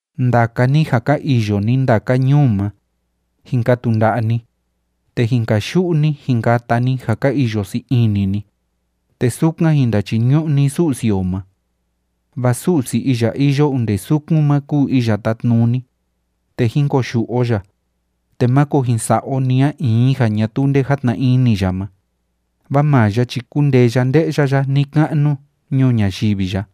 Ndaka ni ja ka iyo ni ndaka ñuu ma, jin katu nda'a ni, te jin kayu'u ni, jin kata ni ja ka iyo sii ini ni, te sukan jin ndachiñu'u ni Su'si o ma. Vaa Su'si iya iyo onde sukun ma kúu Iya Tátnuni, te jín koyu'u o ya, te máko jin sa'a o ni a in ja ñatuu nde játna ini ya ma, vaa maa ya chi kúndee ya nde'ya ya ni‑ka'nu ñuu ñayivi ya.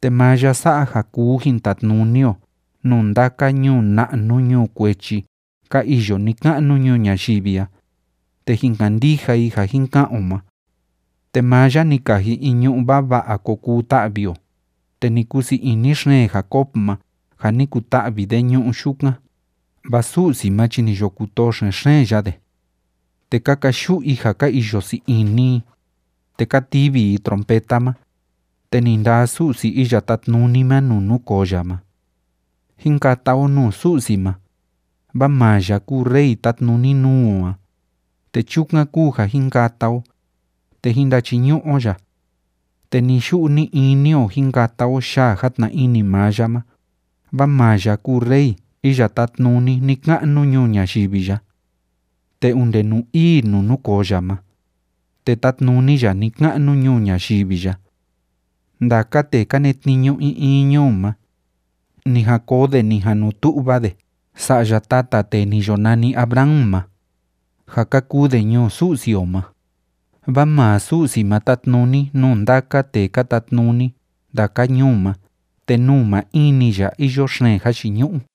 Te maa ya sa'a ja kuu jin tatnuni o nuu ndaka ñuu na'nu ñuu kuechi ka iyo ni‑ka'nu ñuu ñayivi a, te jin kandija i ja jin ka'an o ma. Te maa ya ni kaji in ñu'ú vava'a ko kuu ta'vi o, te ni kusii ini xeen Jacob ma ja ni kuta'vi de ñu'u yukan, vaa Su'si ma chi ni yo kutoo xen‑xeen ya de. Te ka kayu'u i ja ka iyo sii ini i, te ka tivi i trompeta ma, te ni ndaa Su'si Iya Tátnuni ma nuu núkoo ya ma. Jín kata o nuu Su'si ma, vaa maa ya kúu Rey tátnuni nuu o a, te chukan kúu ja jín kata o, te jín ndachiñu'u o ya. Te ni‑yu'u ni‑ini o jín kata o yaa játna ini maa ya ma, vaa maa ya kúu rey iya tátnuni ni‑ka'nu ñuu ñayivi ya. Te onde nuu ii nuu núkoo ya ma, te tátnuni ya ni‑ka'nu ñuu ñayivi ya. Ndaka tee ka netniñu in in ñuu ma, ni jan koo de ni jan nu tu'va de sa'ya tata tee ni yo nani Abraham ma, ja ka kuu de ñuu Su'si o ma. Vaa maa Su'si ma tátnuni nuu ndaka tee ka tatnuni ndaka ñuu ma te nuu maa in‑ni ya iyo xeen jayiñu'u.